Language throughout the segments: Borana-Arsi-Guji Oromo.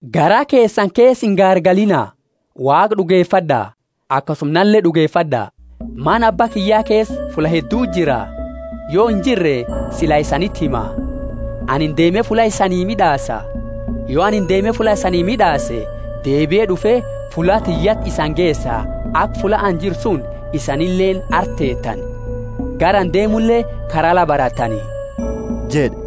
Garaa keesani keesa ingaargaliina. Waaqa d'ugefad'a, akasuma nale d'ugefad'a. Mana Abba kiyya keesa fulla hedduti jira, yo injirre sila isaniti hima. Anini deeme fulla isanii mid'aasa. Yo anini deeme fulla isanii mid'aase, deebie d'ufe fulla tiyyati isani geesa, aka fulla ani jiru suni isanileeni arti teetani. Gara ani deemule kara la barattani jed'e.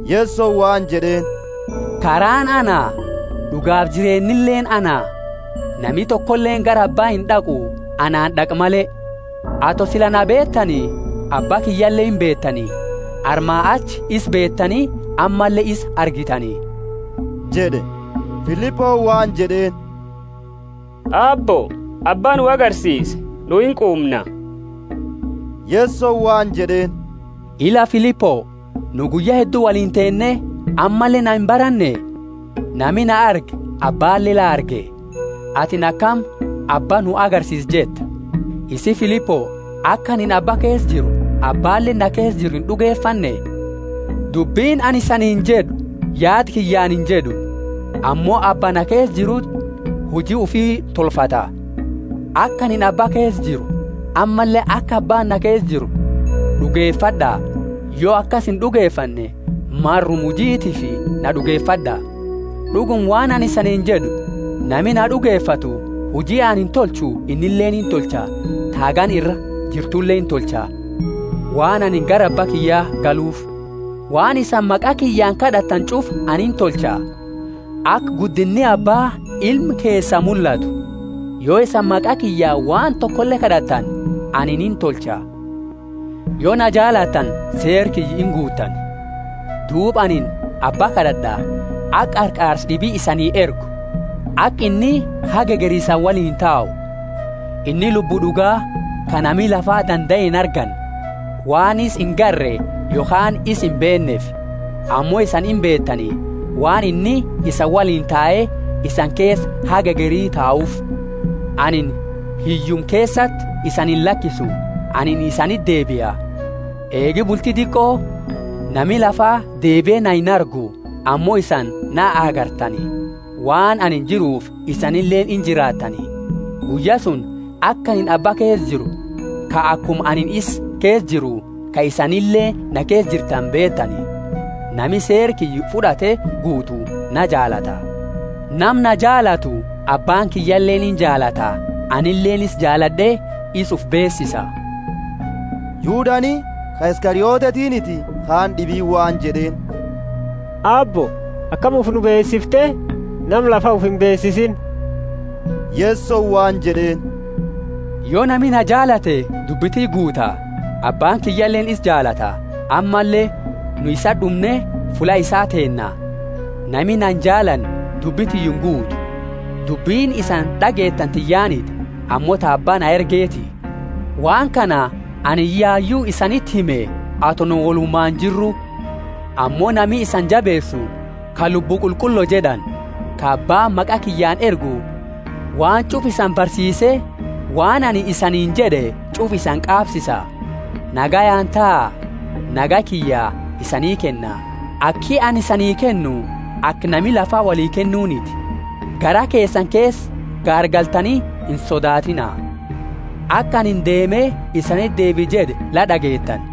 Yesoni waan jed'eeni, Karaani ana, d'ugaafi jireennileeni ana; nami tokoleeni gara Abba ind'aqu, anaani d'aqu male. Ato sila na beetani, Abba kiyyale imbeetani; armaa achi isa beetani ammalle ya isa argitani jed'e. Filiponi waan jed'eeni, Aabbo, Abba nu agarsiisi, nu inquumna. Yesoni waan jed'eeni, Ila Filipo, nu guyya heddu woliini teenne, ammalle na imbaranne? Nami na arge Abbaale la arge. Atini akami, Abba nu agarsiisi jetta? Isii Filipo, aka anini Abba keesa jiru, Abbaaleeni na keesa jiru ind'ugefanne? Dubbini anini isaniini jed'u yaada kiyyaani injed'u. Ammo Abba na keesa jiruti huji ufi tolfata. Aka anini Abba keesa jiru, ammalle aka Abbaani na keesa jiru, d'ugefad'a; yo akasi ind'ugefanne, maruma hujitiifi na d'ugefad'a. D'uguma waan anini isaniini jed'u, nami na d'ugefatu, huji anini tolchu innileeni intolcha, ta hagana ira jirtule intolcha, waan anini gara Abba kiyya galufi. Waan isani maqa kiyyaani kad'atani ch'ufa ani intolcha, aka guddinni Abbaa Ilma keesaa mullatu. Yo isani maqa kiyyaani waan tokole kad'atani, anini intolcha. Yo na jaalatani, seera kiyya inguutani. Duuba anini Abba kad'ad'a, aka qarqaarsa d'ibi isanii ergu, aka inni haga hegeri isani woliini tau. Inni Lubbu d'uga, ka nami lafa dandae inarganne, waan isa ingarre yokhaani isa imbeenneefi. Ammo isani imbeetani, waan inni isani woliini tae, isani keesa haga hegeri tauufi. Anini hiyyuma keesati isani illakisu; anini isaniti deebia. Eegi bulti diqo nami lafa deebie na inargu, ammo isani na agartani, waan anini jiruufi isanileeni injiraattani. Guyya suni aka anini Abba keesa jiru, ka akuma anini isani keesa jiru ka isanileeni na keesa jirtani beetani. Nami seera kiyya fud'ate guutu na jaalata. Nama na jaalatu Abbaani kiyyaleeni injaalata; anileeni isa jaalad'e isa ufi beesisa. Yudani (ka Iskariotetiniti) kaani d'ibiini waan jed'eeni, Aabbo akami ufi nu beesifte nama lafa ufi imbeesisiini? Yesoni waan jed'eeni, Yo nami na jaalate dubbi tiyya guuta, Abbaani kiyyaleeni isa jaalata, ammalle nu isati d'umne fulla isaa teenna. Nami na injaalanne dubbi tiyya inguutu. Dubbini isani d'ageetani tiyyaaniti, ammo ta Abba na ergeti. Waan kana anini, yayu isaniti hime ato nu wolumaani jirru. Ammo nami isani jabeesu, ka Lubbu Qulqullo jed'ani, ka Abbaani maqa kiyyaani ergu, waan ch'ufa isani barsiise waan anini isaniini jed'e ch'ufa isani qaabsiisa. Nagayaani taa, nagayaa kiyya isanii kenna, aki anini isanii kennu aka nami lafa woli kennuniti, garaa keesani keesa gaargaltani insodaatiina. Aka anini, Deeme isaniti deebia jed'e, la d'ageetani.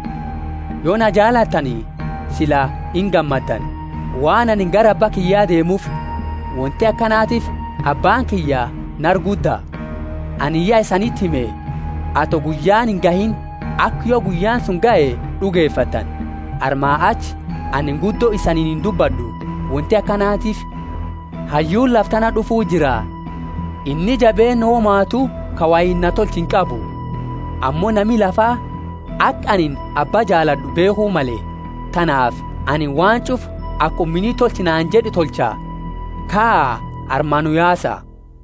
Yo na jaalattani sila ingammaddani, waan anini gara Abba kiyya deemuufi. Wonti akanatiifi Abbaani kiyya nara gudda. Anini ya isaniti hime, ato guyyaani ingahiini, aka yo guyyaani suni gahe d'ugefattani. Armaa achi anini guddo isaniini indubbad'u, wonti akanatiifi hayyuuni lafa tana d'ufuti jira, inni jabeenna womatu ka woiini na tolchu inqabu. Ammo nami lafaa aka anini Abba jaalad'u beekhu male, tanaafi anini waan ch'ufa akuma inni tolchi naani jed'e tolcha. kaa armaa nu yaasa.